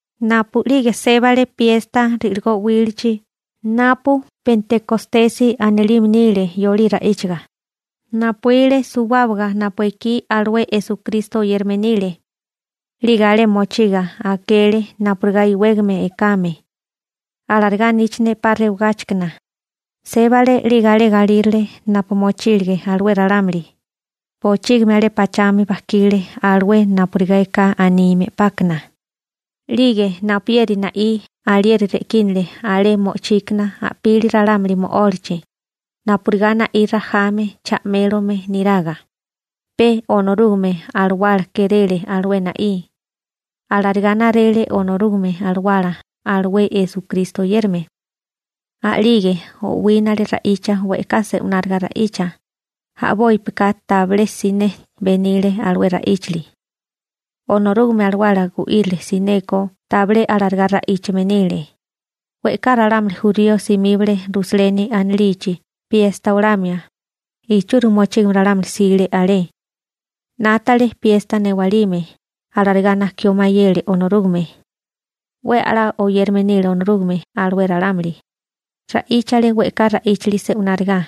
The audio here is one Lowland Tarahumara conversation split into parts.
Napu'lige sébale piesta ri'ligó 'wílichi (napu Pentekostesi anilime nile yolí ra'íchaga), napuíle suwábaga napu ekí alué Esukristo oyérame nile. 'Lige alé mochiga akele napurigá iwégame ekame. Alarigá aníchane 'pa rewagáchikana. Sébale 'lige alé galírale napu mochílige alué ralámuli. Bochígimi alé pachami bajkile alué napurigá eká anime 'pákana. 'Lige napuyeri na'í alieri re'kínale alé mo'ochíkana a'pili ralámuli mo'ólachi, napurigá na'í rajame cha'mélome niraga. Pe Onorúgame Alawala kéréle alué na'í. Alarigá narele Onorúgame Alawala alué Esukristo oyérame. A'lige o'wínale ra'icha we'ká se'wináriga ra'icha, a'bópika tabilé siné benile alué ra'íchali. Onorúgame Alawala gu'írile. Sineko tabilé alarigá ra'íchame nile. We'ká ralámuli jurío simíbale Rusaleni anilichi piesta olamia, ichúrimi mochígame ralámuli jsile alé. 'Nátale piesta newalime, alarigá nakió mayele Onorúgame. 'We a'lá oyérame nile Onorúgame alué ralámuli. Ra'íchale we'ká ra'íchili se'wináriga.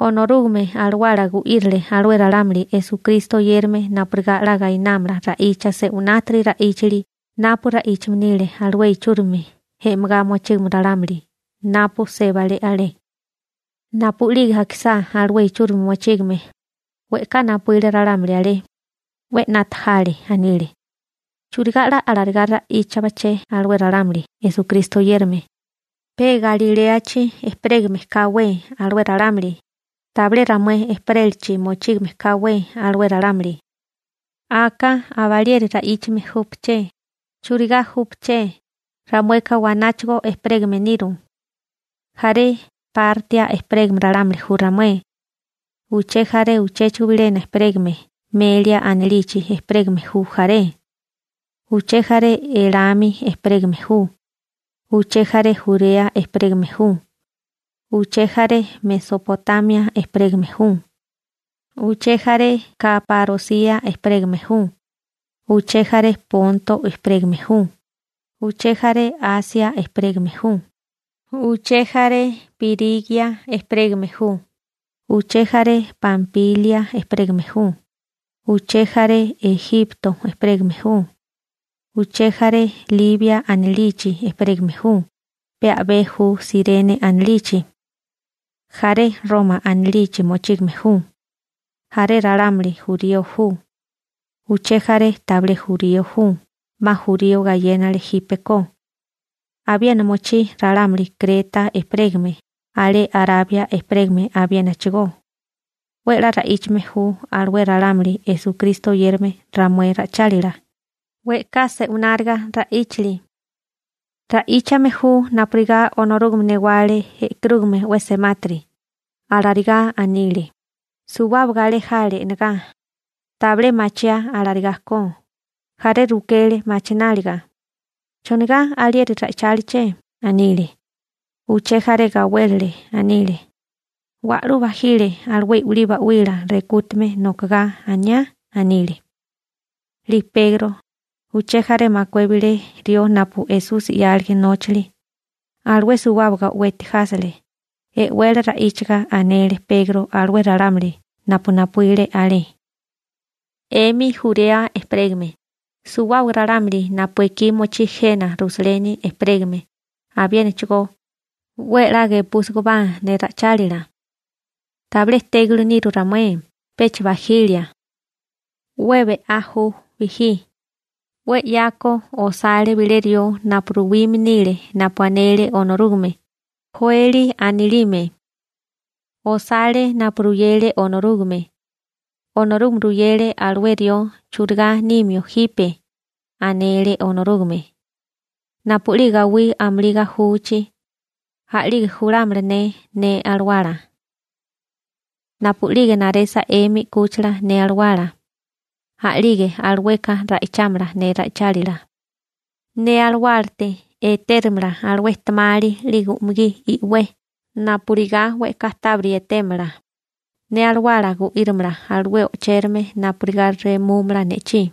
Onorúgame Alawala gu'írile alué ralámuli Esukristo oyérame napurigá 'la gainámala ra'icha se'winátiri ra'íchali napu ra'íchame nile alué ichúrimi e'megá mochígame ralámuli napu sébale alé. Napu'lige akisá alué ichúrimi mochígame, we'ká napuíle ralámuli alé. 'We 'nata jale. Anile: ―¿Churigá 'la alarigá ra'íchabaché alué ralámuli Esukristo oyérame? Pe Galiléachi ejperégame káwé alué ralámuli, tabilé ramué ejperélachi mochígame káwé alué ralámuli. ¿Aka abalieri ra'íchame júpaché? ¿Churigá júpaché? Ramueka wanáchigo ejperégame niru. Jaré Partia ejperégame ralámuli ju ramué. Uché jaré chéchigo bilena ejperégame Melia anilichi ejperégame ju jaré. Uché jaré Elami ejperégame ju. Uché jaré Jurea ejperégame ju. Uché jaré Mesopotamia ejperégame ju. Uché jaré Kaparosia ejperégame ju. Uché jaré Ponto ejperégame ju. Uché jaré Asia ejperégame ju. Uché jaré Pirigia ejperégame ju. Uché jaré Pampilia ejperégame ju. Uché jaré Ejipto ejperégame ju. Uché jaré Libia anilichi ejperégame ju, pe a'bé ju Sirene anilichi. Jaré Roma anilichi mochígame ju. Jaré ralámuli jurío ju. Uché jaré tabilé jurío ju, 'ma jurío gayénale jípeko. Abiena mochí ralámuli Kreta ejperégame, alé Arabia ejperégame abiénachigó. 'We 'la ra'íchame ju alué ralámuli Esukristo oyérame ramué ra'ichálila, we'ká se'wináriga ra'íchali. Ra'íchame ju napurigá Onorúgame newale e'karúgame 'we semátiri ―alarigá anile. Suwábaga alé jale e'negá. Tabilé machiá alarigá ko. Jaré rukele machináliga: ―¿Chonigá alieri ra'icháliché? ―anile. Uché jaré gawélele. Anile: ―Wa'lú bajile alué i'wilí ('uba) ba'wila rekútame nokogá aniá ―anile. 'Lige Pegro, uché jaré makué bilé rió napu Esusi 'yálige nóchali, alué suwábaga o'weti jásele, e'wele ra'íchaga anele Pegro alué ralámuli napu napuíle alé: ―'Emi Jurea ejperégame, suwábaga ralámuli napu ekí mochí jena Rusaleni ejperégame abiénachigó, 'we 'la gepúsigobá ne ra'ichálila. Tabilé tégili niru ramué, pecha bajilia. 'We be'á ju bijí. 'We 'yako osale bilé rió napu ruwime nile napu anele Onorúgame, Joeli anilime. Osale napu ruyele Onorúgame. Onorúgame ruyele alué rió churigá nimio jipe. Anele Onorúgame: Napu'lige gawí amulí gajuchi, a'lige julámala ne ne Alawala. Napu'lige naresa 'emi 'kúchila ne Alawala, a'lige alueka ra'ichámala ne ra'ichálila. Ne Alawálate etérimala alué ejtemali 'lige umugí i'wé napurigá we'ká tábiri etémala. Ne Alawala gu'írimala alué o'chérame napurigá remúmala ne'chí.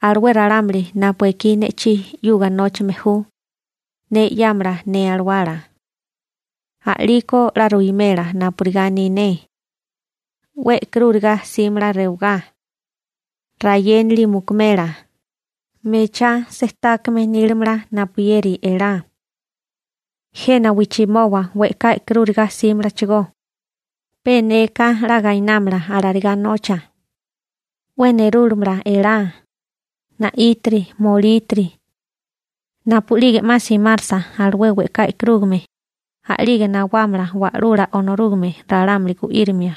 Alué ralámuli napu ekí ne'chí 'yuga nóchame ju, ne 'yámala ne Alawala. A'liko 'la ruwimela napurigá aní ne. 'We e'karúriga 'símala rewagá. Rayénali mukumela. Mechá sejtákame nílimala napuyeri elá. Jena wijchimoba we'ká e'karúriga 'símalachigó. Pe neka 'la gainámala alarigá nocha. 'We nerúmala elá, na'ítiri, molítiri. Napu'lige 'ma simarsa alué we'ká e'karúgame, a'lige nawámala Wa'lula Onorúgame ralámuli gu'írimia.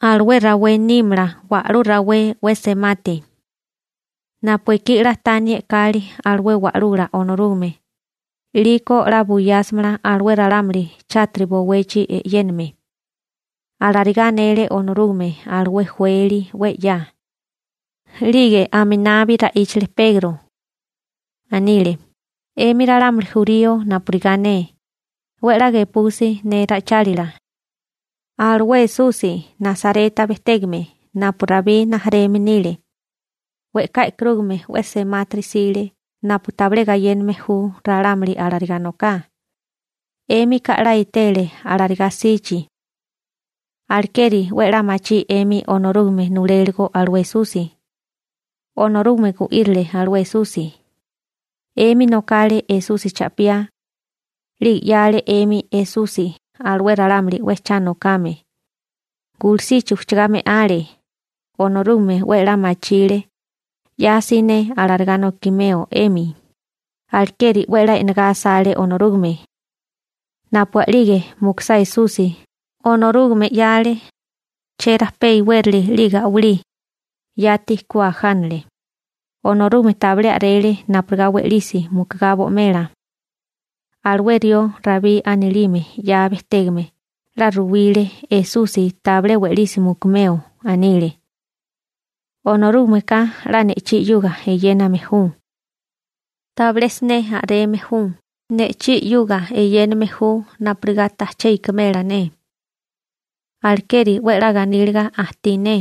Alué rawé nímala wa'lú rawé 'we semati. Napu ekí 'la taní e'kali alué wa'lula Onorúgame, 'liko 'la buyásamala alué ralámuli chátiri bowechi e'yéname. Alarigá anele Onorúgame alué Joeli 'we 'ya. 'Lige aminabi ra'íchale Pegro. Anile: ―'Emi ralámuli jurío napurigá ne, 'we 'la gepusi ne ra'ichálila. Alué Esusi Nasareta bejtégame napu Rabí rijimala nile, we'ká e'karúgame 'we semátiri 'sile napu tabilé gayéname ju ralámuli alarigá noká. 'Émika 'la etele alarigá 'sichi. Alekeri 'we 'la machí 'emi Onorúgame nuléligo alué Esusi. Onorúgame gu'írile alué Esusi. 'Emi nokale Esusi cha'piá. 'Lige 'yale 'emi Esusi alué ralámuli 'we cha nokame. Gulusichi ujchagá me'ale. Onorúgame 'we 'la machile 'ya siné alarigá nokimeo 'emi. Alekeri 'we 'la e'negá asale Onorúgame. Napu a'lige mukusá Esusi, Onorúgame 'yale cherajpé iwérali 'lige a'walí. Yati ku ajánale. Onorúgame tabilé a'rele napurigá we'lisi mukugá bo'mela. Alué rió Rabí anilime 'ya bejtégame 'la ruwile Esusi tabilé we'lisi mukumeo. Anile: Onorúgameka 'la ne'chí 'yuga eyéname ju. Tabilé siné a'reme ju. Ne'chí 'yuga eyéname ju napurigá tajché ikimela ne. Alekeri 'we 'la ganíliga ajtí ne.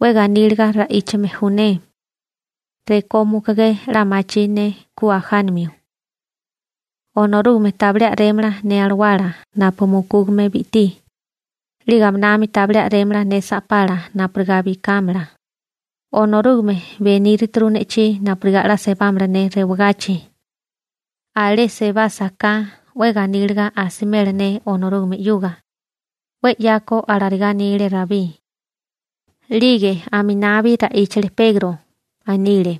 'We ganíliga ra'íchame ju ne. Rekó mukugé 'la machí ne ku ajánamio. Onorúgame tabilé a'rémala ne alawala napu mukúgame bi'tí. 'Lige aminami tabilé a'rémala ne sa'pala napurigá bikámala. Onorúgame benírituru ne'chí napurigá 'la sebámala ne rewagachi. Alé sebásaká 'we ganíliga asimela ne Onorúgame 'yuga. 'We 'yako alarigá anile Rabí. 'Lige aminabi ra'íchale Pegro. Anile: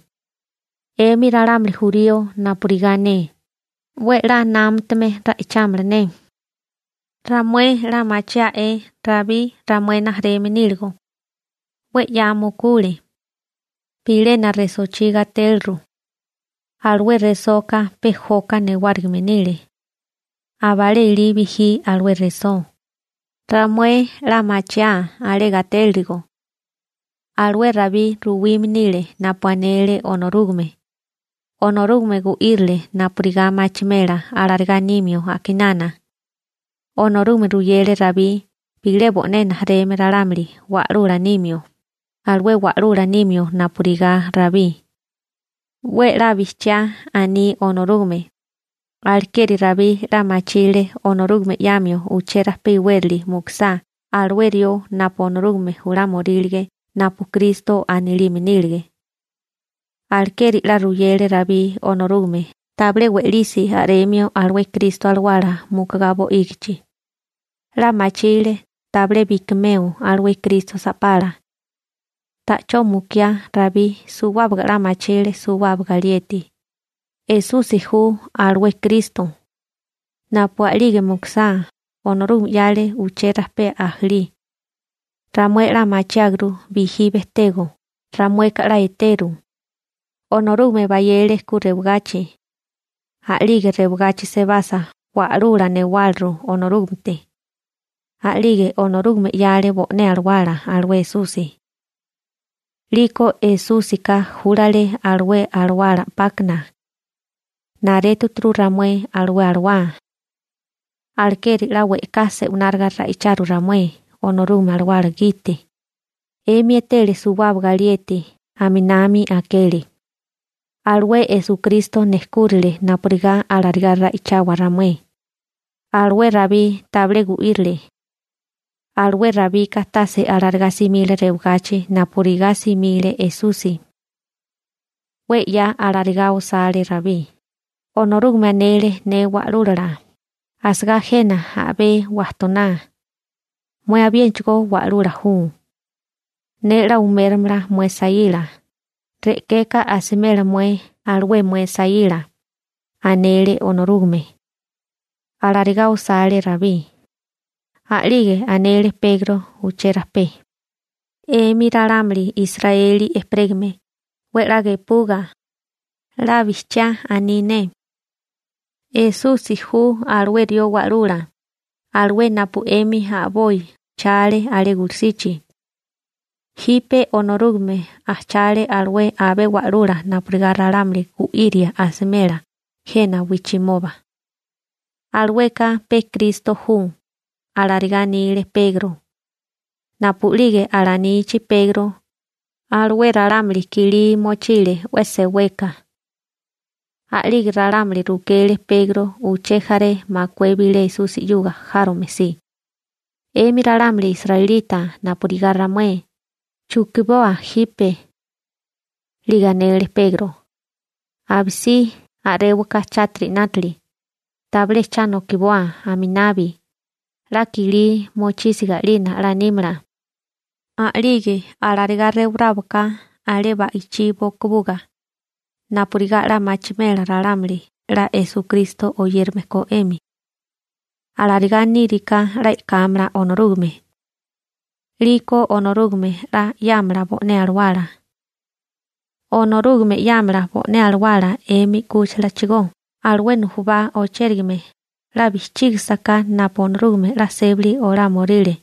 ―'Emi ralámuli jurío napurigá ne, 'we 'la námatame ra'ichámala ne. Ramué 'la machiá'é Rabí ramué rijimala níligo. 'We 'ya mukule. Bilena resochí gatéliru. Alué resoka pe joka newárigime nile. Abalé ilí bijí alué resó. Ramué 'la machiáa alé gatélirigo. Alué Rabí ruwime nile napu anele Onorúgame. Onorúgame gu'írile napurigá machimela alarigá nímio a'kinana. Onorúgame ruyele Rabí bilé bo'né rijimala ralámuli wa'lula nimio, alué wa'lula nimio napurigá Rabí. 'We 'la bijchiá aní Onorúgame. Alekeri Rabí 'la machile Onorúgame 'yamio uché rajpé iwérali mukusá alué rió napu Onorúgame julámorílige napu Kristo anilime nílige. Alekeri 'la ruyele Rabí Onorúgame tabilé we'lisi a'remio alué Kristo alawala mukugá bo'ígichi. 'La machile tabilé bikimeo alué Kristo sa'pala. Ta'chó mukiá Rabí suwábaga 'la machile suwábaga alieti. Esusi ju alué Kristo. Napu a'lige mukusá, Onorúgame 'yale uché rajpé ajalí. Ramué 'la machiáguru bijí bejtego, ramueka 'la eteru. Onorúgame bayele ku rewagachi. A'lige rewagachi sebasa wa'lula newáliru Onorúgamete. A'lige Onorúgame 'yale bo'né Alawala alué Esusi. 'Liko Esúsika júlale alué Alawala 'pákana. Naréturu ramué alué Alawá. Alekeri 'la we'ká se'wináriga ra'icharu ramué Onorúgame Alawala gite. 'Emi etele suwábaga alieti aminami akele. Alué Esukristo nejkúrile napurigá alarigá ra'ichawa ramué. Alué Rabí tabilé gu'írile. Alué Rabika tase alarigá simile rewagachi napurigá simile Esusi. 'We 'ya alarigá osale Rabí: Onorúgame anele ne Wa'lúlala: «Asagá jena a'bé wajtoná. Mué abiénachigo Wa'lula kame. Ne 'la uméromala mué saíla, re'keka asimela mué alué mué saíla», anele Onorúgame. Alarigá osale Rabí. A'lige anele Pegro uché rajpé: ―'Emi ralámuli Israeli ejperégame, 'we 'la gepuga. 'La bijchiá aní ne. Esusi ju alué rió Wa'lula, alué napu 'emi a'boi ujchale alé gulusichi. Jipe Onorúgame ajchale alué abé wa'lula napurigá ralámuli gu'iria asimela jena wijchimoba. Alueka pe Kristo ju ―alarigá anile Pegro. Napu'lige alanichi Pegro, alué ralámuli kilí mochile 'we seweka. A'lige ralámuli rukele Pegro uché jaré makué bilé Esusi 'yuga járome si: ―'Emi ralámuli israelita napurigá ramué, ¿chukiboa jipe? 'Lige anele Pegro: ―Abisí a'réwaká chátiri 'nátili. Tabilé cha nokiboa aminabi, 'la kilí mochísiga 'nalina 'la nímala. A'lige alarigá rewaráwaká alé ba'ichí bokubuga napurigá 'la machimela ralámuli 'la Esukristo oyérame ko 'emi. Alarigá níriká 'la e'kámala Onorúgame. 'Liko Onorúgame 'la 'yámala bo'né Alawala. Onorúgame 'yámala bo'né Alawala 'emi 'kúchilachigó, alué nujubá o'chérigame, 'la bijchígisaká napu Onorúgame 'la sébali olámioríle.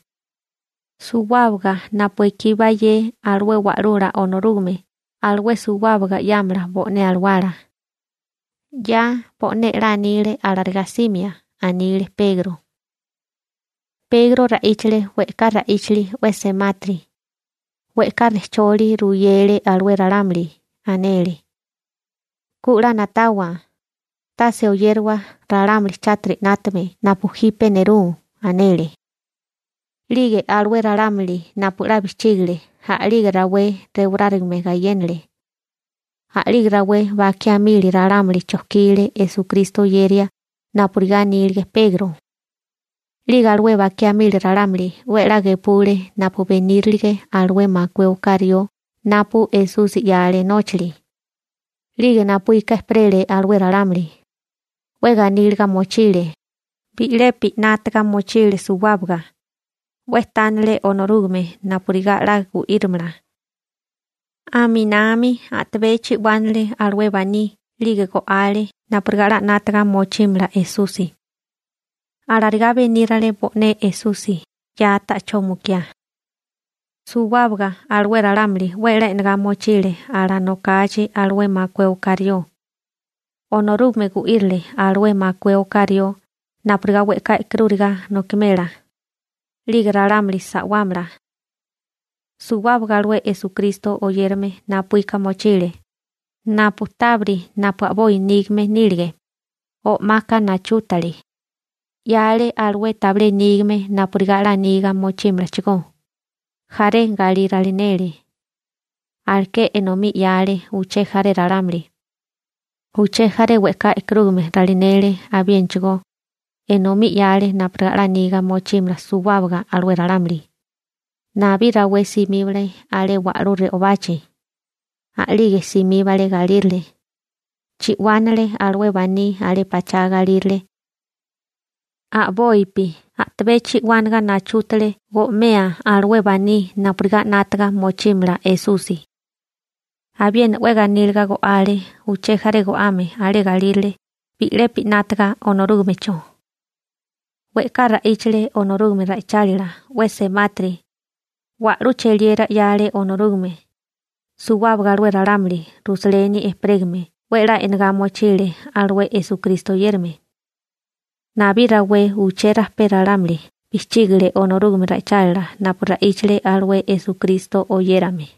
Suwábaga napu ekí bayé alué Wa'lula Onorúgame, alué suwábaga 'yámala bo'né Alawala. 'Ya bo'né 'la anile alarigá 'simia ―anile Pegro. Pegro ra'íchale we'ká ra'íchili 'we semátiri, we'ká rejcholi ruyele alué ralámuli. Anele: ―Ku 'la na'tawa. Tase oyérawa ralámuli chátiri 'nátame napu jipe nerú ―anele. 'Lige alué ralámuli napu 'la bijchígale, a'lige rawé rewarárigame gayénale. A'lige rawé bakiá mili ralámuli chojkile Esukristo oyeria napurigá anílige Pegro. 'Lige alué bakiá mili ralámuli 'we 'la gepule napu benírilige alué makué oká rió napu Esusi 'yale nóchali. 'Lige napuíka ejperele alué ralámuli. 'We ganíliga mochile. Bi'lepi 'nátaga mochile suwábaga. 'We tánele Onorúgame napurigá 'la gu'írimala. Aminami tabé chi'wánale alué baní 'lige go'ale napurigá 'la 'nátaga mochímala Esusi. Alarigá benírale bo'né Esusi 'ya ta'chó mukiá. Suwábaga alué ralámuli 'we 'la e'negá mochile alanokachi alué makué oká rió. Onorúgame gu'írile alué makué oká rió napurigá we'ká e'karúriga nokimela, 'lige ralámuli sa'wámala. Suwábaga alué Esukristo oyérame napuíka mochile. Tabiri napu a'boi nígame nílige, o'maka nachútale, 'yale alué tabilé nígame napurigá 'la niga mochímalachigó. Jaré galí ralinele. Aleké enomí 'yale uché jaré ralámuli. Uché jaré we'ká e'karúgame ralinele abiénachigo. Enomí 'yale napurigá 'la niga mochímala suwábaga alué ralámuli. Nabí rawé simíbale alé wa'lú re'obachi. (Yolí ra'íchaga «templo» anilime nile.) A'lige simíbale galírale. Chi'wánale alué baní alé pachá galírale, a'bopi a'tabé chi'wánaga nachútale go'mea alué baní napurigá 'nátaga mochímala Esusi. Abiena 'we ganíliga go'ale uché jaré go'ame alé galírale, bi'lepi 'nátaga Onorúgamecho. We'ká ra'íchale Onorúgame ra'ichálila 'we semátiri. Wa'lú cheliera 'yale Onorúgame. Suwábaga alué ralámuli Rusaleni ejperégame 'we 'la e'negá mochile alué Esukristo oyérame. Nabí rawé uché rajpé ralámuli bijchígale Onorúgame ra'ichálila napu ra'íchale alué Esukristo oyérame.